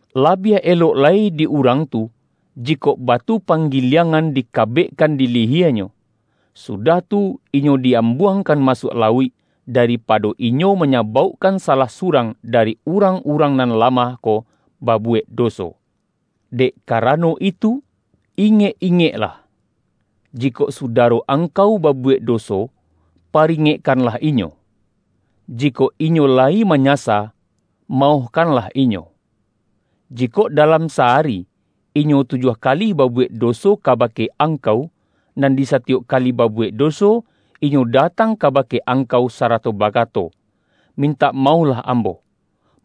Labiah elok lai di urang tu, jikok batu panggiliang-an dikabekkan di liyienyo, sudah tu inyo di-ambuangkan masuak lauik, daripado inyo manyabaukkan salah surang, dari urang-urang nan lamah ko, babuwek doso. Dek karano itu, ingek-ingeklah! Jikok sudaro angkau babuwek doso, paringekkanlah inyo. Jikok inyo layi manyasa, maohkanlah inyo. Jikok dalam sa-ari, inyo tujuah kali babu-wek doso kabake angkau, nan di sa-tiyok kali babuwek doso, inyo datang kabake angkau, sarato bakato, ’ Min-tak maohlah ambo,'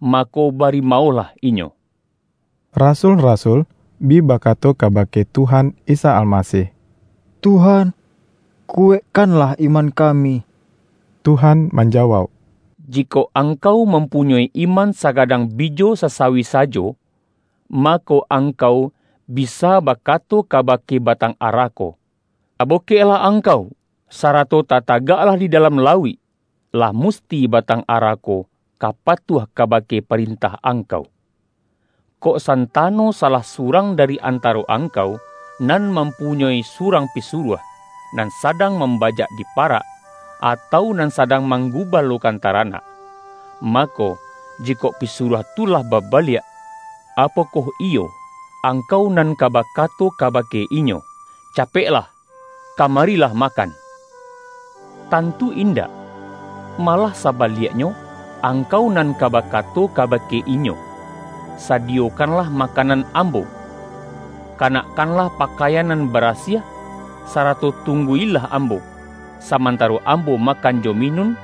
mako, bari ma-ohlah inyo.” Rasul-rasul bi bakato kabake Tuhan Isa Almasih,”Tuhan, kuwaikkanlah iman kami.” Tuhan manjawauk,”Jiko angkau mampunyoi iman sagadang bijo sasawi sajo, mako, angkau bisa ba-kato kabake batang ara ko, ’Tabokek-lah angkau, sarato tatagaklah di dalam lauik,' lah musti batang ara ko ka pa-tuah kabake parentah angkau.” ” Kok santano salah surang dari an-taro angkau, nan mampunyoi surang pisuruah, nan sadang mambajak di pa-rak, atau nan sadang manggubalokan taranak. Mako, jikok pisuruah tu lah babaliak, apokoh iyo angkau nan ka bakato kabake inyo, ’Capeklah, kama-rilah makan!' Tantu indak! Malah sa-baliaknyo, angkau nan ka bakato kaba-ke inyo, ’Sadiyokanlah makanan ambo. Kanakkanlah pakaian nan barasiah, sarato tunggu-ilah ambo, samantaro ambo makan jo minun;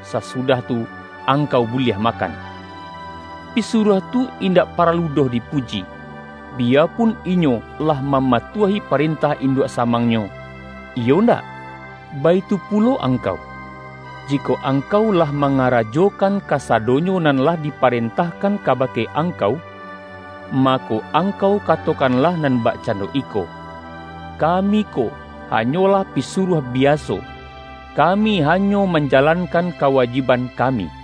sasudah tu, angkau buliah makan.’ Pisuruah tu indak paralu doh dipuji, biyapun inyo lah mamatuahi parentah induak sa-mangnyo, iyo ndak? Baitu pulo ang-kau. Jikok angkau lah mangarajokan kasadonyo nan lah diparentahkan ka-bake angkau, mako, angkau katokan-lah nan bakcando iko, ’ Kami ko ha-nyolah pisuruah biaso; kami hanyo manjalankan kawajiban kami.’”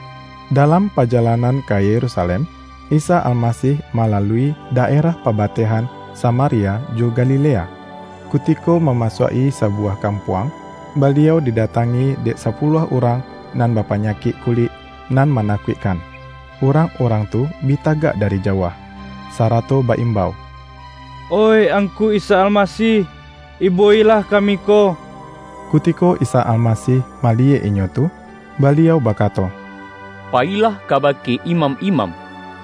Dalam pajalanan ka Yerusalem, Isa Almasih malalui daerah pabatehan Sa-maria jo Galilea. Kutiko mamasuak-i sabuwah kampuang, Baliau didatangi dek sapuluah urang nan bapanyakik kulik nan manakuikkan. Urang-urang tu bi tagak dari jauah, sarato ba-imbau”Oih Angku Isa Almasih! Ibo-ilah kami ko!” Kutiko Isa Almasih maliyek inyo tu, Baliau bakato,”Payilah kabake imam-imam,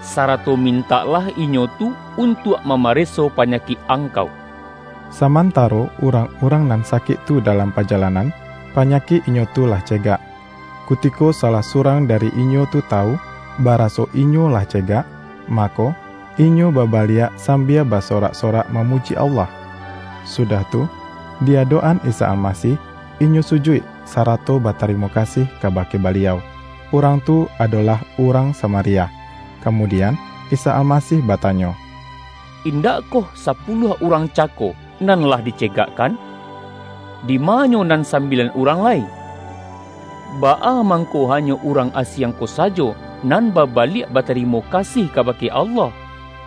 sarato mintaklah inyo tu untuak mamareso panyakik angkau.” Samantaro urang-urang nan sakik tu dalam pajalanan, panyakik inyo tu lah cegak. Kutiko salah surang da-ri inyo tu tawu, baraso inyo lah ce-gak, mako, inyo babaliak sambia ba-sorak-sorak mamuji Allah. Sudah tu, di adok-an Isa Almasih, inyo su-juik sarato batarimo kasih kabake Baliau. Urang tu, adolah urang Sama-ria. Kamudian, Isa Almasih batanyo,”Indakkoh sapuluah urang cako nan lah dicegakkan? Dima nyo nan sam-bilan urang lai? Baa mangko hanyo urang asiang ko sajo, nan babaliak ba-tarimo kasih kabake Allah?”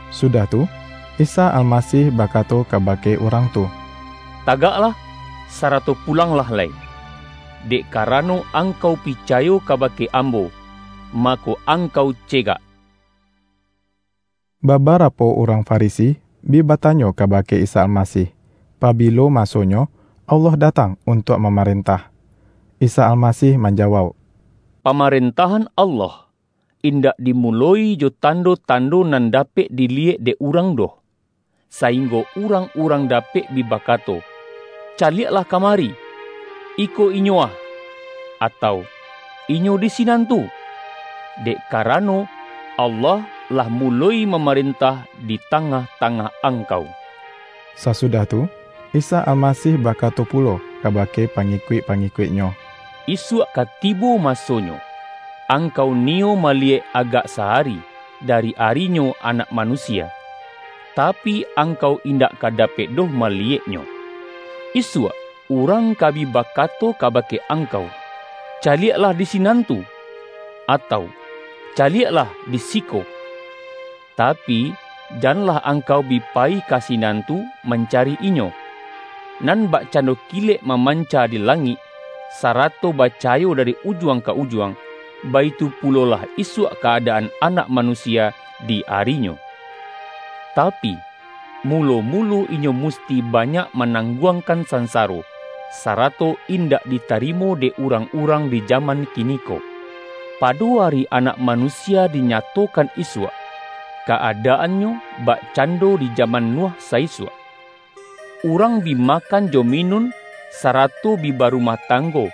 Sudah tu, Isa Almasih bakato kabake urang tu,”Tagaklah, sarato pulanglah lai. Dek karano angkau picayo kabake Am-bo, mako, angkau cegak.” Babarapo urang Farisi bi batanyo kabake Isa Almasih, pabilo masonyo Allah datang untuak mamarentah. Isa Almasih manjawauk,”Pamarentah-an Allah, indak dimuloi jo tando-tan-do nan dapek diliyek dek urang doh, sainggo urang-urang dapek bi ba-kato, ’Caliaklah kamari, iko inyo ah!' atau, ’ Inyo di sinan tu!' Dek karano, Allah lah muloi mamarentah di ta-ngah-tangah angkau.” Sasudah tu, Isa Almasih bakato pulo kabake pangikuik-pangikuik-Nyo,”Isuak ka tibo masonyo, angkau niyo maliyek agak sa-ari, dari ari-Nyo Anak Manusia, tapi, angkau indak ka dapek doh maliyeknyo. Isuak, urang ka bi bakato kabake angkau, ’Caliaklah, di sinan tu!' atau, ’Caliaklah, di siko!' Tapi, janlah angkau bi payi ka sinan tu mancari Inyo. Nan bakcando kilek mamanca di langik, sarato bacahayo dari ujuang ka ujuang, baitu pulolah isuak ka-adaan Anak Manusia di ari-Nyo. Tapi, mulo-mulo Inyo musti ba-nyak manangguangkan sansaro, sara-to indak ditarimo dek urang-urang di jaman kiniko. Pado ari Anak Manu-sia dinyatokan isuak, ka-adaannyo bak-cando di jaman Nuh sa-isuak. Urang bi makan jo minun, sarato bi barumah tanggo;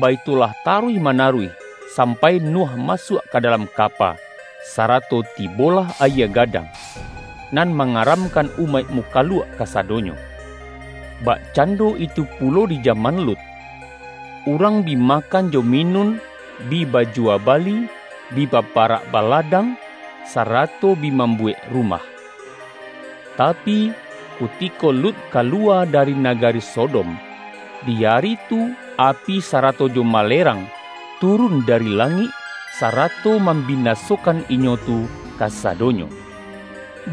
baitulah taruih manaruih, sam pai Nuh masuak ka dalam kapa, sarato tibolah ayie gadang, nan mangaramkan umaik mukaluak kasadonyo. Bakcando itu pulo di jaman Lut. Urang bi makan jo minun bi bajuwa bali, bi baparak baladang, sarato bi mambuwek rumah. Tapi, kutiko Lut kaluwa dari nagari Sodom, di ari tu api sarato jo malerang, turun dari la-ngik, sarato mambinasokan inyo tu kasadonyo.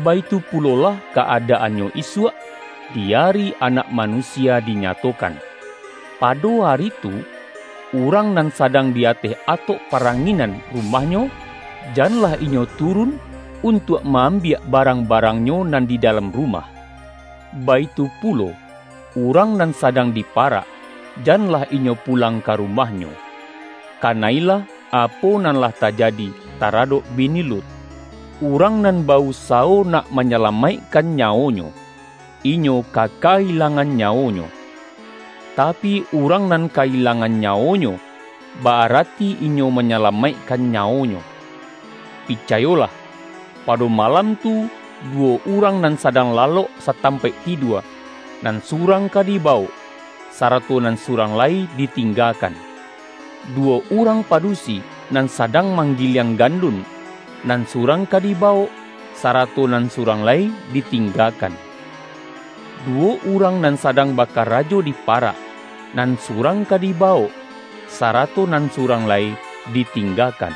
Baitu pulolah ka-ada-annyo isuak, di ari Anak Manusia di-nyatokan. Pado ari tu, urang nan sadang di ateh atok paranginan rumahnyo, janlah inyo turun, untuak ma-ambiak barang-barangnyo nan di dalam rumah. Baitu pulo, urang nan sadang di parak, jan-lah inyo pulang ka rumahnyo. Kana-ilah, apo nan lah tajadi taradok bini Lut. Urang nan ba-usawo nak manyala-maikkan nyawonyo, inyo ka ka-ilangan nyawonyo. Tapi, urang nan ka-ilangan nyawonyo, ba-arati inyo manyalamaik-kan nyawonyo. Picayolah: Pado ma-lam tu, duwo urang nan sadang lalok satampaik tidua, nan surang ka diba-wok, sarato nan surang lai ditingga-kan. Duwo urang padusi, nan sadang manggiliang gandun, nan surang ka di-bawok, sarato nan surang lai ditingga-kan. [ Duwo urang nan sadang baka-rajo di parak, nan surang ka dibawok, sarato nan surang lai ditinggakan.]”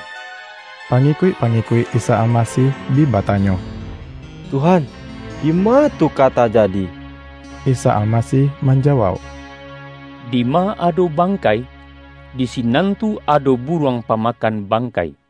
Pangikuik-pangikuik Isa Almasih bi batanyo,”Tuhan, dima tu ka ta-jadi?” Isa Almasih manjawauk,”Dima ado bangkai, di sinan tu ado buruang pa-makan bangkai.”